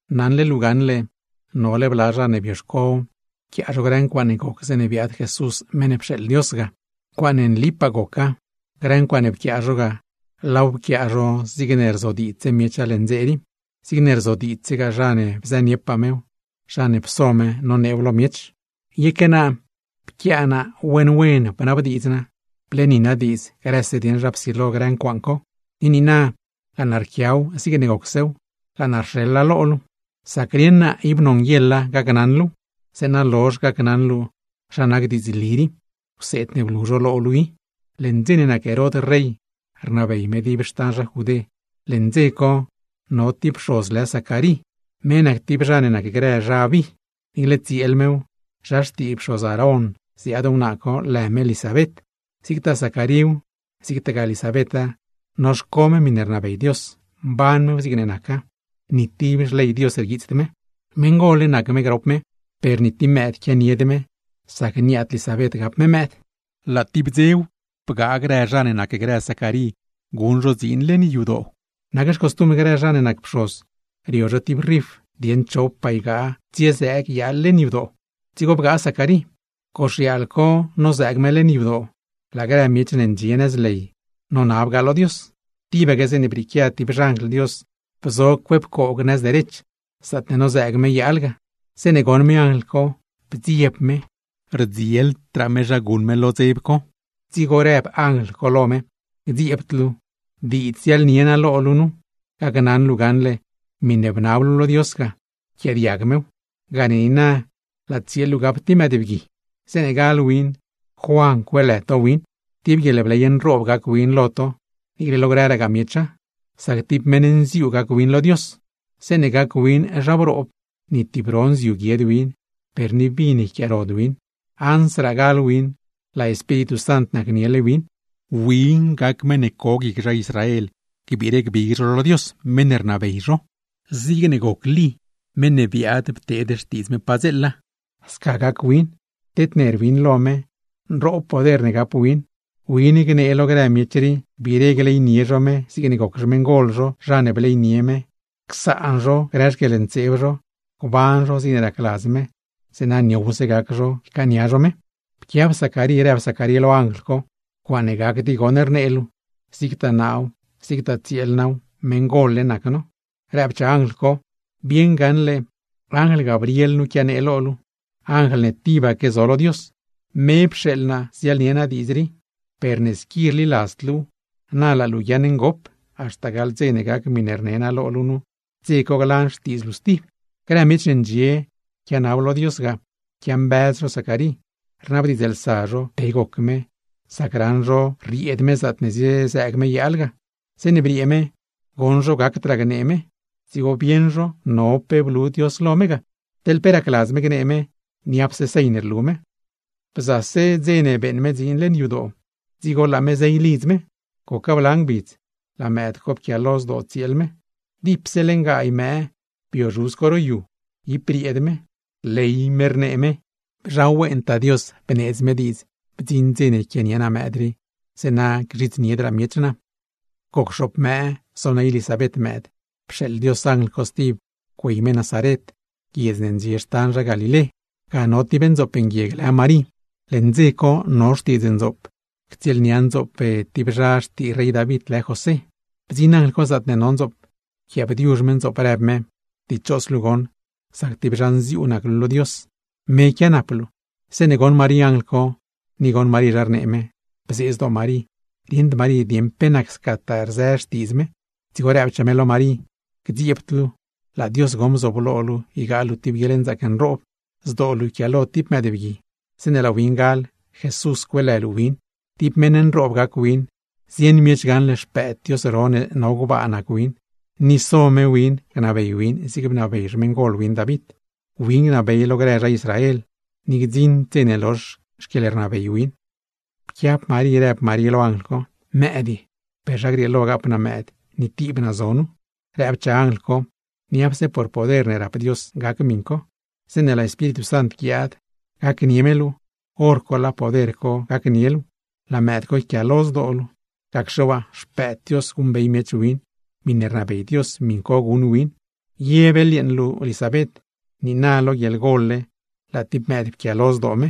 Naṉle luu gaṉle, nole bla zha ne bioxco pquiaa zho grë ncuaaṉe goc zeeṉe biaad Jesús meṉ ne pxeeḻ Dios ga. Ncuaaṉe nlipaa goca, grë ncuaaṉe pquiaa zho ga, laaw pquiaa zho zigne rzodiidzse miecha leṉ dze rii, zigne rzodiidzsegaa zha ne bzëniepaa mew, zha ne pso me noneew lo miech. Yeque naa pquiaa naa wen wen bnabdiidz naa, bleeni naa diidz grëse dieṉ zha psilo grë ncuaaṉ co; ni niina laa naa rquiaw zigne gocsew laaw rxeḻ naa lo luu. Sac rieṉ naa ib nonguieḻa gacnaṉ luuw; zeeṉa lozh gacnaṉ luu zha nac diidzli rii, wseed ne blu zho lo luu i. Leṉ dze ne nac Herod rey rnabey me dib xtan zha Judé, leṉ dze co no tib pxoz lë Zacarí, me nac tib zha ne nacgrë “Zha Abí”. Niicle tsieel mew, zha xtii pxoz Aarón ziaad wnaa co, lë me Lisabet. Zigtaa Zacaríw, zigtaa Lisabeta, noxco me miṉe rnabey Dios, mban mew zigne naca, ni tib xley Dios rguiitsd me. Meṉ gol-le nac me grop me, per ni tib mëëd quianied me, sac niaad Lisabet gapd me mëëd. Laa tib dzew bgaa grë zha ne nacgrë Zacarí guṉ zho dziin leṉ yadoo. Nac xcostumbr grë zha ne nac pxoz, rio zho tib rif dieṉ chopaa ygaa tsielaadz goxyaal leṉ yadoo, dzigo bgaa Zacarí. Goxyaal co nolaadz me leṉ yadoo, laa grë miech ne ndxie nëz ley nonabgaa lo Dios, tibaque zeeṉe brieequia tib xanjl Dios bzo cue pcoog nëz derech, zaatne nozëëg me yaal ga. Zeeṉe goṉ me anjl co bdzieb me, rdzieldraa me zha guṉ me lo dzeb co. Dzigo rëb anjl co lo me: ―¡Gdzieebd luu! Diidzse ziaḻnie naa lo luu, gacnaṉ luu gaṉle miṉe bnab luu lo Dios ga, pquiaadiag mew; gane niina laa tsieel luu gap tib mëëdbgui. Zeeṉe gal win, Juan cueelë to win. Tib guieḻbley nroob gac win lo to, niicle lo grëragaa miecha, sac tib meṉ nziuu gac win lo Dios. Zeeṉe gac win zha broob, ni tib ro nziu guied win, per ni vin yquiaarod win; ansraa gal win, laa Espíritu Sant nacniele win. Win gac meṉ ne co guic nzian grë zha Israel, gbiire gbig zho lo Dios, meṉ ne rnabey zho. Zigne goc Lí, meṉ ne biaad pteed xtiidz me padzeela, sca gac win tedner win lo me, nroob poder ne gap win. Win gnee lo grë miech rii, gbiire gleynie zho me zigne goc xmeṉgol zho zha ne bleynie me; csaan zho grë xquieḻntseeb zho, gban zho zigne racladz me; zeeṉa niowse gac zho ycaania zho me. Pquiab Zacarí rëb Zacarí lo anjl co: ―¡Ncuaaṉe gacd i goṉ rnee luu! Zigtaa naaw, zigtaa tsieel naaw, meṉgol-le nac no. Rëbchaa anjl co: ―Bieṉ gaṉle anjl Gabriel nu quianee lo luu, anjl ne tibaque zo lo Dios. Me pxeeḻ naa ziaḻnie naa diidz rii. Per ne squi rliladzd luuw, na laa luu guiaaṉ ngop, haxta gaḻ dze ne gac miṉe rne naa lo luu nu, dze co glan xtiidz luu stib. Grë miech ne ndxie quianab lo Dios ga, quiambëz zho Zacarí, rnabdiidzlsa zho pe goc me, sac raṉ zho rrieed me zaatne ziezëëg me yaal ga. Zeeṉe briee me, goṉ zho gacdraa gnee me, dzigo bieṉ zho no pe blu Dios lo me ga. Teḻ pe racladz me gnee me, niapse señ rlu me. Bzase dze ne beeṉ me dziin leṉ yadoo, dzigo laa me zey lidz me. Goca bla ngbidz, laa mëëd co pquialo zdoo tsieel me. Dipse leṉ gaay mëë bio zhuz co ro yu, ib brieed me, rley me rnee me: ―¡Zha wentaa Dios, bneedz me diidz bdziṉ dze yquianie naa mëëd rii, zeeṉa gzhidzniedraa miech naa! Goc xoop mëë zoney Lisabet mëëd, pxeeḻ Dios anjl co stib güey me Nazaret, guiedz ne ndxie xtan zha Galilé. Ga no tib ndzoop nguieg lë Marí, leṉ dze co no xtiidz ndzoop co ctsieelnia ndzoop tib zha xtii rey David, lë José. Bdziṉ anjl co zaatne no ndzoop, pquiaabdiuzh me ndzoop, rëb me: ―¡Dichos luu goṉ, sac tib zha nziuu nac luu lo Dios! Me quianap luu. Zeeṉe goṉ Marí anjl co, ni goṉ Marí zha rnee me, bzee zdoo Marí, rieṉd Marí dieṉ pe nac scataa rzë xtiidz me. Dzigo rëbchaa me lo Marí: ―¡Gdzieebd luu! Laa Dios goṉ bzooblo luu ygaa luu tib guieḻnzaac nroob. Zdoo luu yquiaalo tib mëëdbgui, zeeṉe laa win gal, JESUS cueelë luu win. Tib meṉ nroob gac win, zieṉ miech gaṉle Xpëëd Dios ro ne no gbaa nac win; ni so me win gnabey win zig bnabey xmeṉgol win David. Win gnabey lo grëse zha Israel, ni gdziṉd dze ne lozh xquieḻrnabey win. Pquiab Marí rëb Marí lo anjl co: ―¿Mëëd ye? ¿Per zha grieelo gap naa mëëd, ni tib naa zo nu? Rëbchaa anjl co: ―Niapse por poder ne rap Dios gac miṉ co. Zeeṉe laa Espíritu Sant guiaad gacnie luu, hor co laa poder co gacnie luu, laa mëëd co yquiaalo zdoo luu; gacxe waa Xpëëd Dios guṉbey miech win, miṉe rnabey Dios miṉ co guṉ win. Ye beḻyeeṉ luu Lisabet, niina lo guieḻgol-le laa tib mëëd pquialo zdoo me;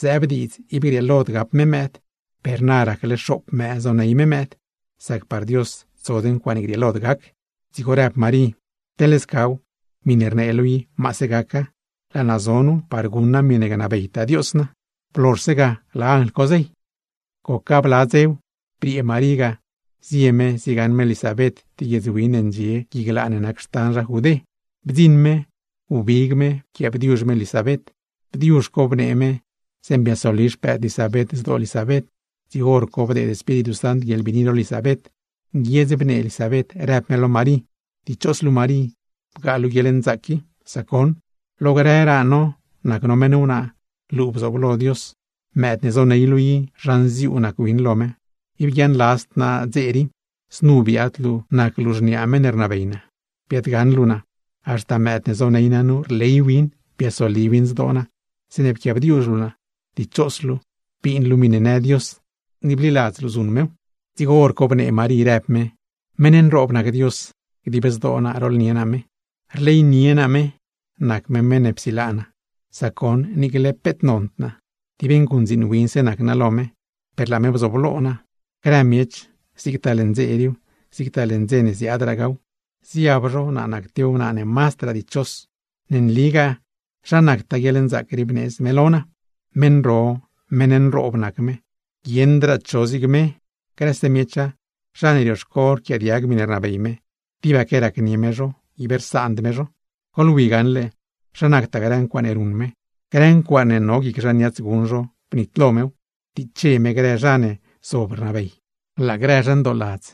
zëëb diidz ib grieelod gap me mëëd, per na racle xoop mëë zoney me mëëd, sac par Dios tsod ncuaaṉe grieelod gac. Dzigo rëb Marí: ―Teḻ scaw, miṉe rnee luu i, maase gaca. Laa naa zo nu par guṉ naa miṉe gnabeytaa Dios naa. Blozhse ga, laa anjl co zey. Goc bla dzew, briee Marí ga zie me ziegaṉ me Lisabet tib guiedz win ne ndxie gui glaa ne nac xtan zha Judé. Bdziṉ me, wbig me pquiaabdiuzh me Lisabet. Bdiuzh co bnee me, zeeṉe biasoli xpëëd Lisabet zdoo Lisabet; dzigo hor co bdeed Espíritu Sant guieḻbiini lo Lisabet, nguiedz bnee Lisabet rëb me lo Marí: ―¡Dichos luu Marí bgaa luu guieḻnzaac qui! Sac goṉ, lo grëraa no nac no meṉ wnaa, luu bzooblo Dios. Mëëd ne zoney luu i, zha nziuu nac win lo me. ¡Ib guiaaṉladzd naa dze rii, znu biaad luu nac luu xniaa meṉ ne rnabey naa, biaadgaṉ luu naa! Haxta mëëd ne zoney naa nu, rley win biasoli win zdoo naa, zeeṉe pquiaabdiuzh luu naa. ¡Dichos luu, bin luu miṉe në Dios, ni bliladz luu zuṉ mew! Dzigo hor co bnee Marí rëb me: ¡Meṉ nroob nac Dios! ¡Gdib zdoo naa rooḻnie naa me! Rleynie naa me nac me meṉ ne psilaa naa, sac goṉ niicle peet nond naa, tib nguṉdziin winse nac naa lo me, per laa me bzooblo naa. Grë miech, zigtaa leṉ dze riiw, zigtaa leṉ dze ne ziaadragaaw, ziab zho naa nac tib wnaa ne mazdraa dichos. Ne nligaa zha nactaa guieḻnzaac rii bneedz me lo naa. Meṉ ro, meṉ nroob nac me, ¡guieṉdraa cho zig me! Grëse miecha, zha ne rioxco rquiaadiag miṉe rnabey me, tibaque racnie me zho, ib rsaand me zho. ¡Goḻwi gaṉle zha nactaa grë ncuaaṉe ruṉ me! Grë ncuaaṉe no guic zha niats guṉ zho, bnitlo mew, ptiche me grë zha ne zob rnabey. Laa grë zha ndooladz,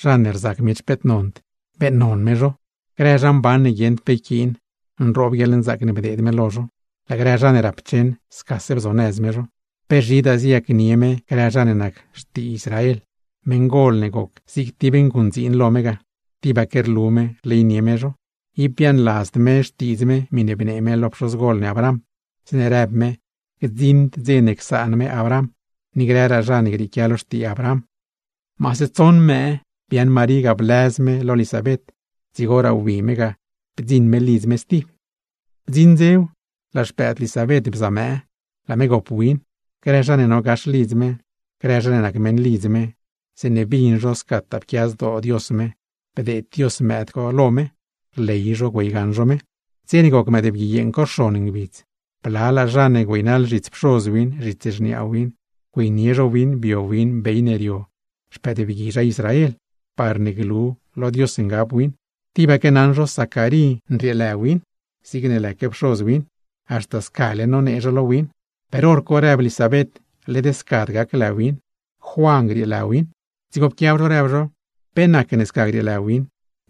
zha ne rzac miech peet nond, beeṉnon me zho. Grë zha mban ne guieṉd pe yquiin, nroob guieḻnzaac ne bdeed me lo zho, laa grë zha ne rapcheṉ, scase bzonëz me zho. ¡Pe zhidaa ziyacnie me grë zha ne nac xtii Israel, meṉgol ne goc zig tib nguṉdziin lo me ga! ¡Tibaque rlu me rleynie me zho! Ib biaaṉladzd me xtiidz me miṉe bnee me lo pxozgol ne Abraham, zeeṉe rëb me gdziṉd dze ne csaan me Abraham, ni grëraa zha ne grieequia lo xtii Abraham. Maase tsoṉ mëë biaaṉ Marí ga blëz me lo Lisabet, dzigoraa wbi me ga bdziṉ me lidz me stib. Bdziṉ dzew, laa xpëëd Lisabet bza mëë, laa me gop win. Grë zha ne no gax lidz me, grë zha ne nac meṉlidz me, zeeṉe bin zho scataa pquia zdoo Dios me bdeed Dios mëëd co lo me, rley zho güeygaṉ zho me. Dze ne goc mëëdbgui yeeṉ co xon ngbidz, blalaa zha ne güeynaḻ zhits pxoz win, zhits xniaa win güeynie zho win bio win bey ne rio xpëëdbgui zha Israel, parne glu lo Dios ngab win. Tibaque naṉ zho Zacarí nrieelë win, zigne lëque pxoz win, haxta scale nonee zho lo win, per hor co rëb Lisabet, led scad gac lë win, Juan grieelë win. Dzigo pquiab zho rëb zho: ―¿Pe nacne sca grieelë win?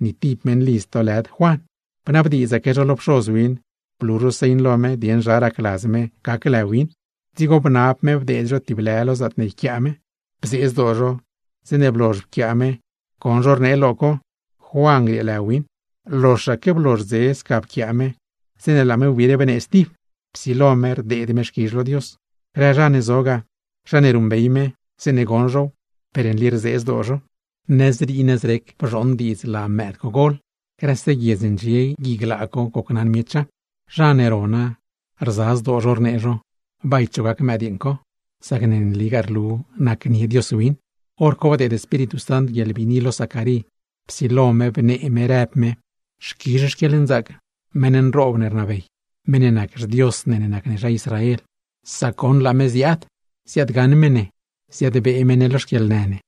Ni tib meṉlidz to lëd Juan. Bnabdiidzaque zho lo pxoz win, blu zho señ lo me dieṉ zha racladz me gac lë win. Dzigo bnab me bdeed zho tib lë lo zaatne yquiaa me; bzee zdoo zho zeeṉe blozh pquiaa me goṉ zho rnee lo co: “Juan grieelë win.” Loxaque blozh dze sca pquiaa me, zeeṉe laa me wbiire bnee stib, psilo me rdeed me xquizh lo Dios. Grë zha ne zo ga, zha ne ruṉbey me, zeeṉe goṉ zhow, per nli rzee zdoo zho. (Nëzrii nëzrec bzhooṉ diidz laa mëëd co gol, grëse guiedz ne ndxie gui glaa co gocnaṉ miecha. Zha ne rona, rza zdoo zho rnee zho: “¿Bay cho gac mëdyeeṉ co?” Sac nligaa rlu nacnie Dios win.) Horco bdeed Espíritu Sant guieḻbiini lo Zacarí, psilo me bnee me rëb me: ¡Xquizh xquieḻnzaac meṉ nroob ne rnabey, meṉ ne nac xDios ne nac ne zha Israel! Sac goṉ laa me ziaad, ziaadgaṉ me ne, ziadbee me ne lo xquieḻnë ne.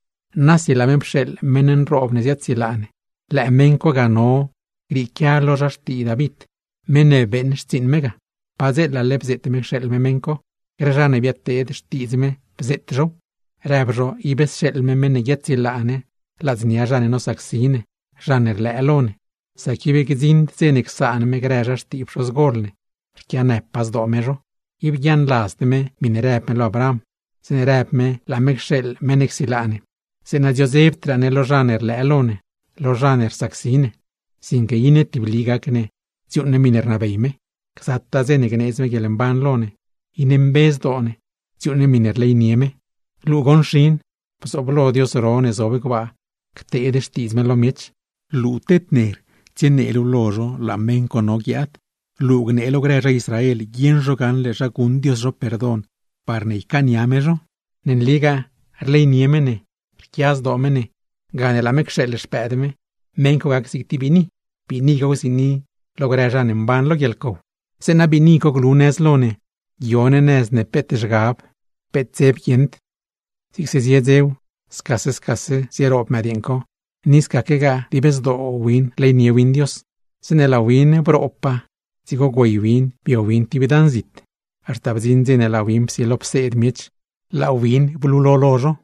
Nasi laa me pxeeḻ meṉ nroob ne ziaadsilaa ne, lëë meṉ co ga no grieequia lo zha xtii David, meṉ ne beeṉ xtsiiṉ me ga. Padzeelale bzeet me cxeeḻ me meṉ co, grë zha ne biaad pteed xtiidz me, bzeet zhow. Rëb zho, ib sxeeḻ me meṉ ne guiaadsilaa ne ladznia zha ne nosacsi ne, zha ne rlëë lo ne. Sac ib gdziṉd dze csaan me grë zha xtii pxozgol ne, rquianëpaa zdoo me zho. Ib guiaaṉladzd me miṉe rëb me lo Abraham, zeeṉe rëb me laa me cxeeḻ meṉ ne csilaa ne, zeeṉa dziodzebdraa ne lo zha ne rlëë lo ne, lo zha ne rsacsi ne; sinque iṉe tibli gac ne dziuuṉ ne miṉe rnabey me. Gzataa dze ne gneedz me guieḻmban lo ne, iṉe mbe zdoo ne, dziuuṉ ne miṉe rleynie me. Luu goṉ xin, bzooblo Dios ro ne zob gbaa, cteed xtiidz me lo miech, luu tedner tsienee luu lo zho, laa meṉ co no guiaad. Luu gnee lo grë zha Israel, guieṉ zho gaṉle zha guṉ Dios zho perdon, parne ycaania me zho. Ne nligaa rleynie me ne, rquia zdoo me ne, gane laa me cxeeḻ Xpëëd me, meṉ co gac zig tib biini, Biini co gziini lo grë zha ne mban lo guieḻcow, zeeṉa biini co glu nëz lo ne, guio ne nëz ne peet zhgab, peet dzeb guieṉd. Zigse zie dzew, scase scase zieroob mëdyeeṉ co, ni scaquegaa dib zdoo win rleynie win Dios. Zeeṉe laa win broobpaa, dzigo güey win bio win tib dan zit, haxta bdziṉ dze ne laa win psilo pseed miech laa win blulo lo zho.